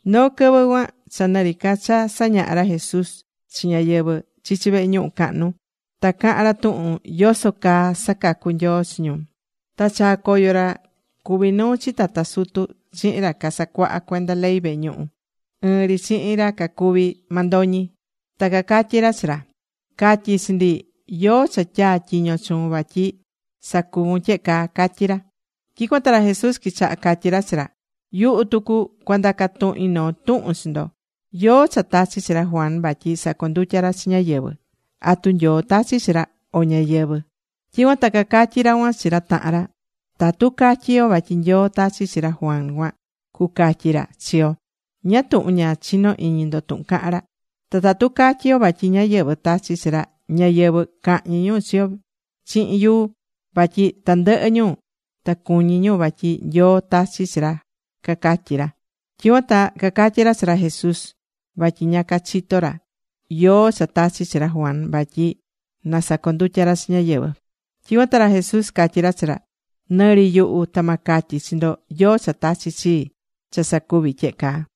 Noo quɨvɨ cuan cha nɨ ri ca cha sañahá ra Jesús chi ñáyɨvɨ chichi vehe ñuhu cahnu, ta cahán ra tuhun yoso caa sacacú Nyoo chi ñu. Ta chaa̱ coyo ra cuví nuu chi tata sutu chihin ra casacuahá cuenda ley vehe ñuhu, ɨɨn ri chihin ra cacuví mandoñi. Ta cacatyí ra chi ra: ―Ca̱tyi chi ndi ¿yóó cha tyaa̱ tyiño chuun vatyi sacuvun tyehe caa? ―catyí ra. Tyicuan ta ra Jesús quichaha catyí ra chi ra: ―Yuhu tucu cua ndaca tuhin noo tuhun chi ndo. ¿Yóó cha tachi̱ chi ra Juan vatyi sacondutya ra chi ñáyɨvɨ? ¿Atu Nyoo tachi̱ chi ra, o ñáyɨvɨ? Tyicuan ta cacatyí ra cuan chi ra tahan ra: ―Tatu catyí yo vatyi Nyoo tachi̱ chi ra Juan cuan, cucatyi ra chi yo “Ñáá tuhun ña chinó iñi ndo tuhun caha̱n ra.” Ta tatu catyí yo vatyí ñáyɨvɨ tachi̱ chi ra, ñáyɨvɨ cahñi ñu chi yo chihin yuu. Vatyi tandɨhɨ ñu, ta cuñí ñu vatyi Nyoo tachi̱ chi ra ―cacatyí ra. Tyicuan ta cacatyi ra chi ra Jesús vatyi ña cachitó ra yóó cha tachi̱ chi ra Juan vatyi na sacondutya ra chi ñáyɨvɨ. Tyicuan ta ra Jesús catyí ra chi ra: ―Nɨ ri yuhu, ta ma catyi chi ndo yóó cha tachi̱ chii, cha sacuvi tyehe caa.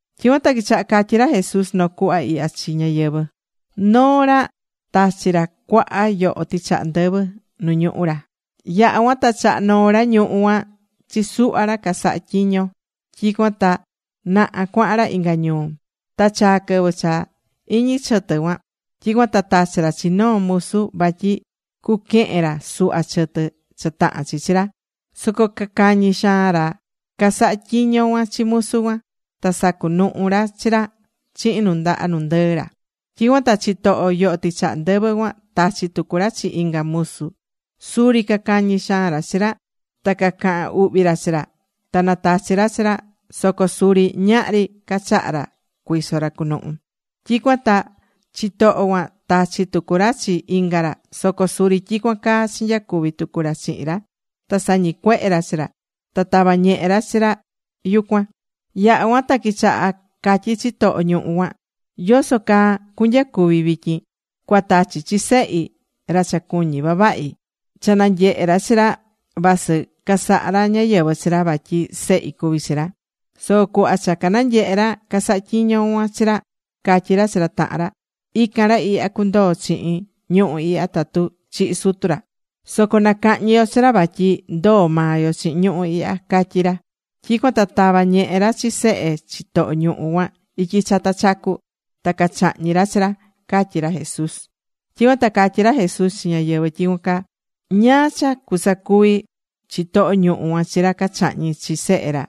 Tyicuan ta quichaha catyi ra Jesús noo cuhva ihya chi ñáyɨvɨ: ―Noo ra tachi̱ ra cuaha yoho tɨchaha ndɨvɨ nu ñuhú ra. Yaha̱ cuan ta chaha̱ noo ra ñuhú cuan chi suhva ra casaha tyiño. Tyicuan ta naha cuahan ra inga ñuu. Ta chaa̱ quɨvɨ cha iñí chɨtɨ cuan. Tyicuan ta tachi̱ ra chi noo musu vatyi cuquehen ra suhva chɨtɨ cha tahán chi chi ra. Soco cacañi xaan ra casahá tyiño cuan chi musu cuan. Ta sacunuhu ra chi ra chihin nu ndaha nu ndɨɨ ra. Tyicuan ta chitoho yoho tɨchaha ndɨvɨ cuan tachi̱ tucu ra chi inga musu. Suri cacañi̱ xaan ra chi ra. Ta cacahan uhvi ra chi ra. Ta natachi̱ ra chi ra. Soco suri ñahri cachaha ra cuiso ra cunuhu. Tyicuan ta chitoho cuan tachi̱ tucu ra chi inga ra. Soco suri tyicuan caa chinyacuvi tucu ra chihin ra. Ta sañicuehe̱ ra chi ra. Ta tava̱ ñehe ra chi ra yucuan. ’Yaha̱ cuan ta quichaha catyi chitoho ñuhu cuan: “¿Yoso caa cunyacuvi vityin? Cua tachi chi sehi, ra cha cuñí vavahi. Ta cha nanyehe ra chi ra, vasɨ casaha ra ñáyɨvɨ chi ra, vatyi sehi cuví chi ra.” Soco cuhva cha cananyehe̱ ra casahá tyiño cuan chi ra, catyí ra chi ra tahan ra: “Ican ra ihya cundoo chihin ñuhú ihya tatu chihi sutu ra. Soco nacahñi yo chi ra. Vatyi ndoo maa yo chihin ñuhú ihya”, catyí ra. Tyicuan ta tava̱ ñehe ra chi sehe chitoho ñuhú cuan ityi chata chacu. Ta cachahñi̱ ra chi ra ―catyí ra Jesús. Tyicuan ta catyí ra Jesús chi ñáyɨvɨ nyicú cuan: ―¿Ñáá cha cusacuvi chitoho ñuhú cuan chi ra cachahñi̱ chi sehe ra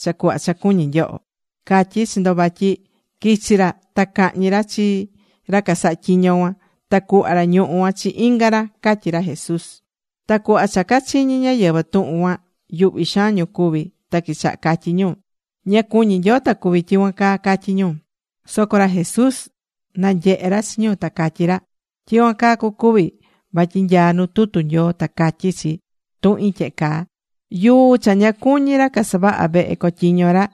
cha cuhva cha cuñí nyoho? Catyí chi ndo vatyi quichi ra ta cahñi ra chi ra casahá tyiño cuan. Ta cuhva ra ñuhú cuan chi inga ra ―catyí ra Jesús. Ta cuhva cha chiñi ñáyɨvɨ tuhun cuan, yuhví xaan ñu cuví. Ta quichaha catyí ñu: ―¡Ña cuñi Nyoo ta cuvi tyicuan caa! ―catyí ñu. Soco ra Jesús nanyehe ra chi ñu ta catyí ra: ―Tyicuan caa cucuvi. Vatyi nyaá nu tutu Nyoo ta catyí chi tuhin tyehe caa: Yuu cha ña cuñí ra casavahá vehe cotyiño ra,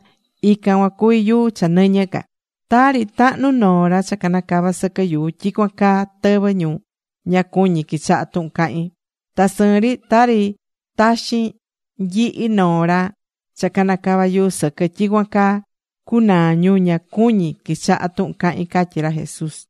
Ican cuan cuví yuu cha nɨñɨ ca. Tari tahnu noo ra cha canacava sɨquɨ yuu, tyicuan caa tɨvɨ ñu ña cuñí quichaha tuhun cahín. Ta sɨɨn ri, tari taxin nyihi noo ra cha canacava yuu sɨquɨ, tyicuan caa cunaa ñu ña cuñí quichaha tuhun cahín ―catyí ra Jesús.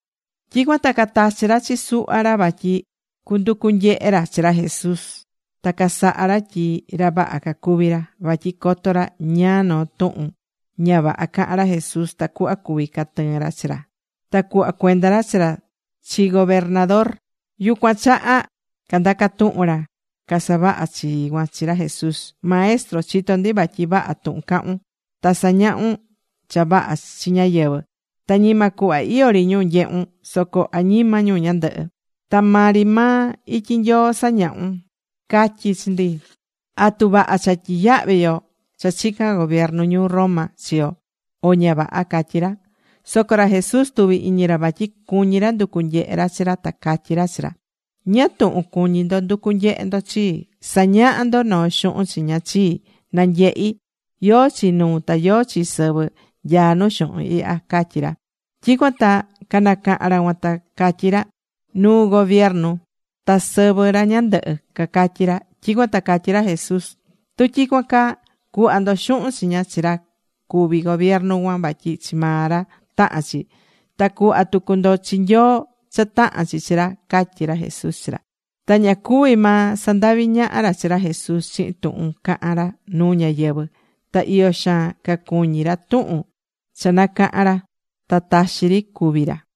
Tyicuan ta catachi̱ ra chi suhva ra vatyi cunducu nyehe ra chi ra Jesús. Ta casaha̱ ra tyi ra vaha cacuvi ra. Vatyi coto ra ñáá noo tuhun ña vaha cahán ra Jesús tacuhva cuvi catɨɨn ra chi ra. Ta cuhva cuenda ra chi ra chi gobernador. Yucuan chaha candaca̱ tuhun ra casavaha chii cuan chi ra Jesús: ―Maestro, chitó ndi vatyi vaha tuhun cahún. Ta sañahún cha vaha chi ñáyɨvɨ. Ta ñima cuhva iyó ri ñu nyehun soco añima ñu ñandɨhɨ. Ta maa ri maa ityi Nyoo sañahún. Ca̱tyi chi ndi ¿atu vaha cha tyiyahvi yo cha chicán gobiernu ñuu Roma chi yo, o ña vaha? ―catyí ra. Soco ra Jesús tuví iñi ra vatyi cuñí ra nducu nyehe ra chi ra. Ta catyí ra chi ra: ―¿Ñáá tuhun cuñí ndo nducu nyehe ndo chii? Sa̱ñaha ndo noo xuhun chiña chii, na nyehi. ¿Yóó chi nuu ta yóó chi sɨvɨ nyaá nu xuhun ihya? ―catyí ra. Tyicuan ta nacaha̱n ra cuan, ta catyí ra: ―Nuu gobiernu, ta sɨvɨ ra ñandɨhɨ ―cacatyí ra. Tyicuan ta catyí ra Jesús: ―Tu tyicuan caa, cu̱hva ndo xuhun chiña chi ra cuví gobiernu cuan vatyi chi maa ra tahán chi. Ta cu̱hva tucu ndo chi Nyoo cha tahán chi chi ra ―catyí ra Jesús chi ra. Ta ña cuví maa sandahvi ñaha ra chi ra Jesús chihin tuhun cahán ra nuu ñáyɨvɨ. Ta iyo xaan cacuñí ra tuhun cha nacaha̱n ra. Ta taxi ri cuví ra.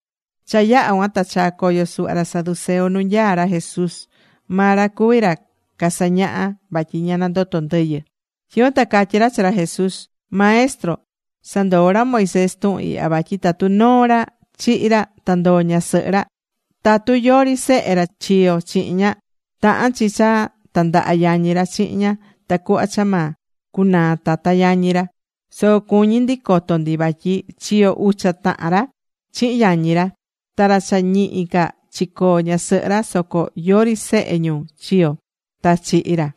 Cha yaha̱ cuan ta chaa̱ coyo suhva ra saduceo nu nyaá ra Jesús. Maa ra cuví ra casañahá vatyi ña nandotó ndɨyɨ. Tyicuan ta catyí ra chi ra Jesús: ―Maestro, sandoo̱ ra Moisés tuhun ihya vatyi tatu noo ra chihi̱ ra ta ndoo ñasɨhɨ ra, tatu yori sehe ra chiyo̱ chihin ña, tahán chi cha tandaha yañi ra chihin ña tacuhva cha ma cunaa tata yañi ra. Soco cuñí ndi coto ndi vatyi chiyo̱ ucha tahan ra chihin yañi ra. Ta ra cha ñihi ca chicoo̱ ñasɨhɨ ra, soco yori sehe ñu chiyo̱, ta chihi̱ ra.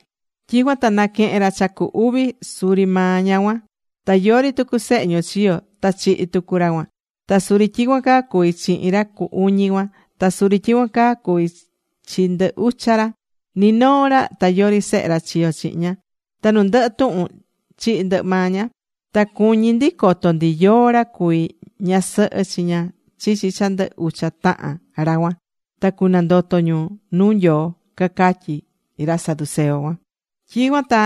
Tyicuan ta naquehe̱n ra cha cu uvi suri maa ña cuan. Ta yori tucu sehe ñu chiyo̱. Ta chihi̱ tucu ra cuan. Ta suri tyicuan caa cuvi̱ chihin ra cu uñi cuan. Ta suri tyicuan caa cuví chi ndɨ ucha ra. Ni noo ra ta yori sehe ra chiyo̱ chihin ña. Ta nu ndɨhɨ tuhun chihi̱ ndɨhɨ maa ña. Ta cuñí ndi coto ndi yóó ra cuví ñasɨhɨ chi ña chichi cha ndɨ ucha tahan ra cuan nu cunandoto ñu nuu Nyoo ―cacatyí ra saduceo cuan. Tyicuan ta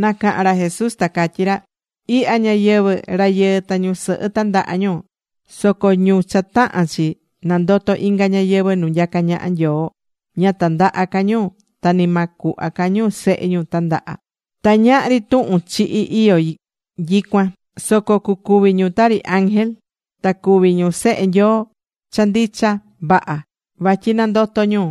nacaha̱n ra Jesús, ta catyí ra: ―Ihya ñayɨvɨ̱, rayɨɨ ta ñusɨhɨ tandaha ñu. Soco ñu cha tahán chi nandoto inga ñayɨvɨ̱ nu nyacá ñaha Nyoo, ña tandaha ca ñu ta ni ma cuhva ca ñu sehe ñu tandaha. Ta ñahri tuhun chihi iyó nyicuan. Soco cucuvi ñu tari ángel. Ta cuví ñu sehe Nyoo cha ndicha vaha vatyi nandoto̱ ñu.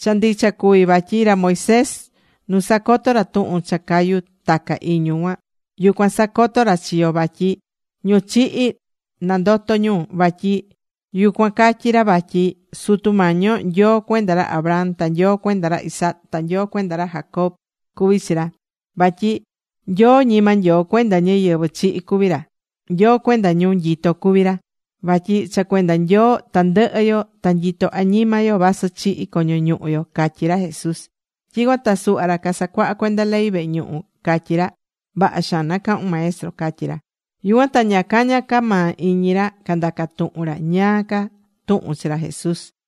Cha ndicha cuví vatyi ra Moisés nu sacoto̱ ra tuhun cha cayu taca iñu cuan, yucuan sacotó ra chi yo vatyi ñu chihi nandotó ñu. Vatyi yucuan catyí ra vatyi Sutu Mañi yo Nyoo cuenda ra Abraham, ta Nyoo cuenda ra Isaac, ta Nyoo cuenda ra Jacob, cuví chi ra. Vatyi Nyoo ñima Nyoo cuenda ñáyɨvɨ chihi cuví ra. Nyoo cuenda ñu nyitó cuví ra. Vatyi cha cuenda Nyoo tandɨhɨ yo ta nyitó añima yo vasɨ chihi̱ coño ñuhu yo ―catyí ra Jesús. Tyicuan ta suhva ra casacuahá cuenda ley vehe ñuhu catyí ra: ―Vaha xaan nacahu̱n Maestro ―catyí ra. Yucuan ta ña caña ca maa iñi ra candaca tuhun ra ñáá ca tuhun chi ra Jesús.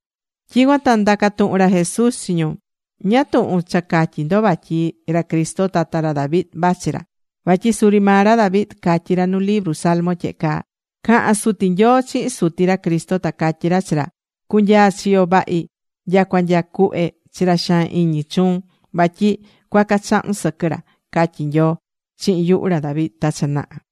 Tyicuan ta ndaca̱ tuhun ra Jesús chi ñu: ―¿Ñáá tuhun cha catyí ndo vatyi ra Cristo tata ra David vachi ra? Vatyi suri maa ra David catyí ra nu libru Salmo tyehe caa: Cahán Suti Nyoo chihin Suti ra Cristo, ta catyí ra chi ra: “Cu̱nyaa chiyo vahi nyacua nya cuhve chi ra xaan iñi chuun vatyi cuaca chahun sɨquɨ ra”, catyí Nyoo chihin yuhu ra David ta cha naha.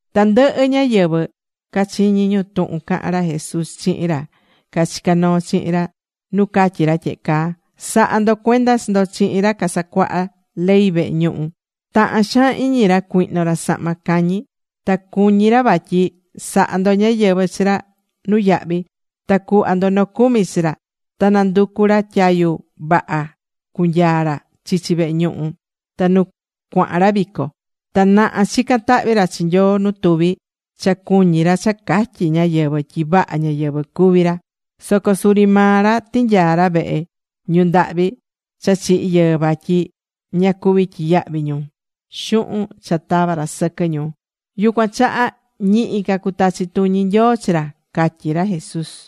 Tandɨhɨ ñáyɨvɨ cachiñí ñu tuhun cahán ra Jesús chihin ra cachicá noo chihin ra nu catyí ra tyehe caa: ―Sa̱ha ndo cuenda chi ndo chihin ra casacuahá ley vehe ñuhu. Tahán xaan iñi ra cuihno ra sahma cañi. Ta cuñí ra vatyi saha ndo ñáyɨvɨ chi ra nuyahvi ta cuhva ndo nocumi chi ra. Ta nanducú ra tyayu vaha cunyaa ra chichi vehe ñuhu ta nu cuahan ra vico. Ta naha chicán tahvi ra chi Nyoo nu tuvi, cha cuñí ra cha catyi ñáyɨvɨ tyi vaha ñáyɨvɨ cuví ra. Soco suri maa ra tinyaá ra vehe ñu ndahvi cha chihi̱ yɨɨ vatyi ña cuví tyiyahvi ñu xuhun cha tavá ra sɨquɨ ñu. Yucuan chaha ñihi ca cutachi tuñi Nyoo chi ra ―catyí ra Jesús.